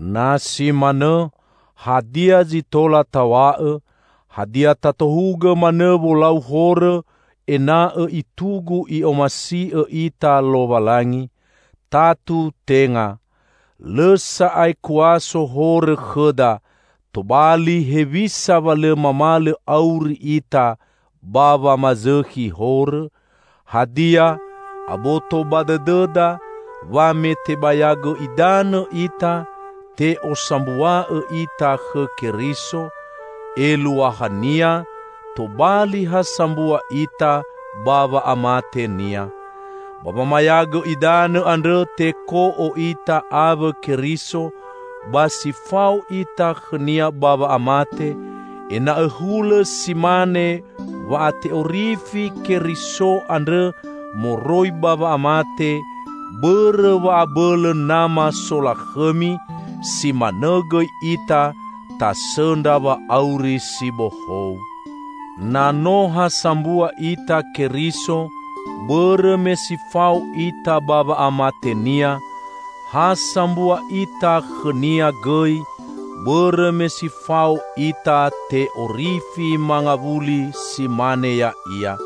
Na si manõ, hadia zi tola taw̃a'õ? Hadia tatohugõ manõ wolau horõ ena'õ itugu I'omasi'õ ita Lowalangi? Tatu tenga! Lõ sa'ae kuaso horõ khõda, tobali hewisa wa lõ mamalõ auri ita ba wamazõkhi horõ? Hadia, aboto ba dõdõda wa me tebayagõ idanõ ita, te'osambua'õ ita khõ Keriso? Eluahania tobali ha sambua ita ba wa'amate-Nia. Ba wamayagõ idanõ andrõ teko'o ita awõ Keriso ba si fao ita khõ-Nia ba wa'amate, ena'õ hulõ si mane wa'ate'orifi Keriso andrõ moroi ba wa'amate bõrõ wa'abõlõ Nama solakhõmi, si manõ gõi ita tasõndra wa'auri si bohou. Na no ha sambua ita Keriso bõrõ me si fao ita ba wa'amate-Nia, ha sambua ita khõ-Nia gõi bõrõ me si fao ita te'orifi mangawuli si mane Ya'ia.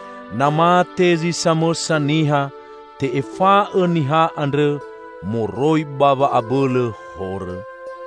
Na mate zi samõsa niha, te'efa'õ niha andrõ moroi ba wa'abõlõ horõ.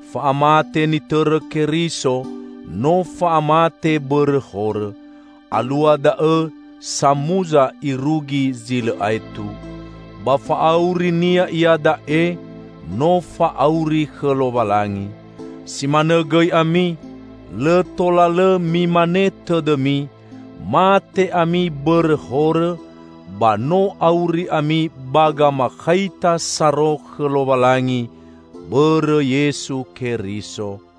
Fa'amate nitõrõ Keriso no fa'amate bõrõ horõ. Alua da'õ samuza irugi zi lõ aetu. Ba fa'auri-Nia iada'e no fa'auri khõ Lowalangi. Si manõ gõi ami, lõ tola lõ mimane tõdõmi; mate ami bõrõ horõ, ba no auri ami ba gamakhaita saro khõ Lowalangi bõrõ Yesu Keriso.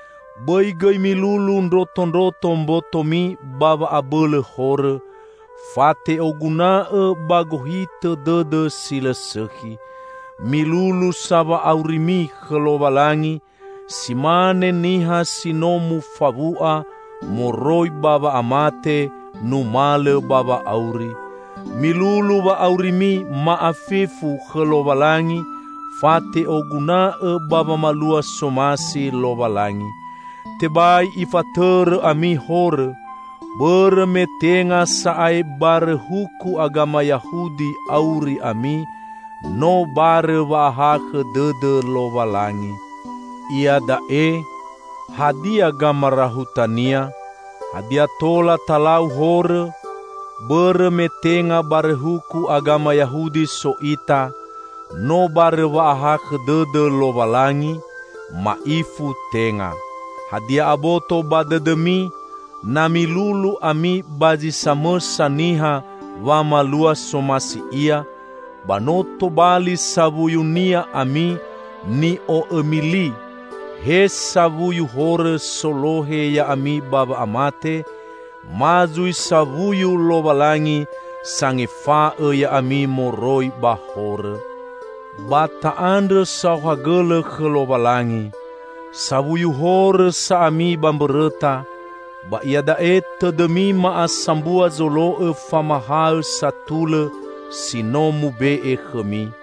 Bõi gõi milulu ndrotondroto mbotomi ba wa'abõlõ horõ, fate'oguna'õ ba gohitõ dõdõ si lõ sõkhi. Milulu sa wa'aurimi khõ Lowalangi si mane niha si no mufawu'a moroi ba wa'amate numalõ ba wa'auri. Milulu wa'aurimi ma'afefu khõ Lowalangi fate'oguna'õ ba wamalua somasi Lowalangi. Tebai ifatõrõ ami horõ, bõrõ me tenga sa'ae barõ huku agama Yahudi auri ami, no barõ wa'ahakhõ dõdõ Lowalangi. Iada'e, hadia gamarahutania? Hadia tola talau horõ, bõrõ me tenga barõ huku agama Yahudi so ita, no barõ wa'ahakhõ dõdõ Lowalangi? Ma'ifu tenga! Hadia aboto ba dõdõmi na milulu ami ba zi samõsa niha wamalua somasi ia, ba no tobali sawuyunia ami ni'o'omi li -- he sawuyu horõ solohe ya'ami ba wa'amate, ma zui sawuyu Lowalangi sangefa'õ ya'ami moroi ba horõ. Ba ta'andrõ saohagõlõ khõ Lowalangi! Sawuyu horõ sa ami ba mbõrõta, ba iada'e tõdõmi ma'asambua zolo'õ famahaõ satulõ si no mube'e khõmi.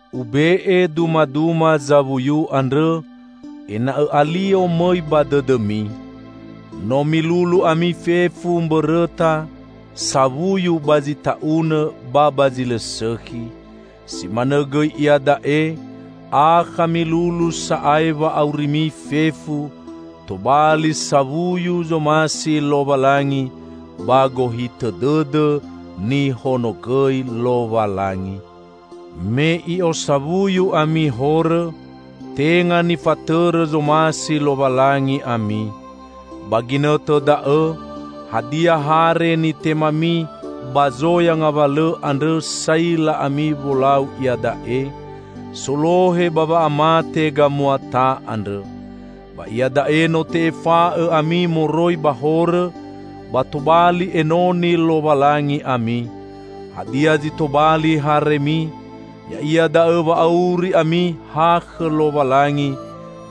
Ube'e dumaduma zawuyu andrõ, ena'õ alio mõi ba dõdõmi. No milulu ami fefu mbõrõta sawuyu ba zi ta'unõ ba ba zi lõ sõkhi. Si manõ gõi iada'e, akha milulu sa'ae wa'aurimi fefu tobali sawuyu zomasi Lowalangi ba gohitõ dõdõ nihonogõi Lowalangi. Me i'osawuyu ami horõ, tenga nifatõrõ zomasi Lowalangi ami. Ba ginõtõ da'õ, hadia hare nitemami ba zoya ngawalõ andrõ saila ami wolau iada'e? Solohe ba wa'amate gamuata andrõ! Ba iada'e no te'efa'õ ami moroi ba horõ, ba tobali enoni Lowalangi ami. Hadia zi tobali haremi, ya'ia da'õ wa auri ami ha khõ Lowalangi,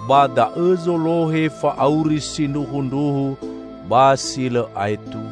ba da'õ zolohe fa'auri sindruhundruhu ba si lõ aetu.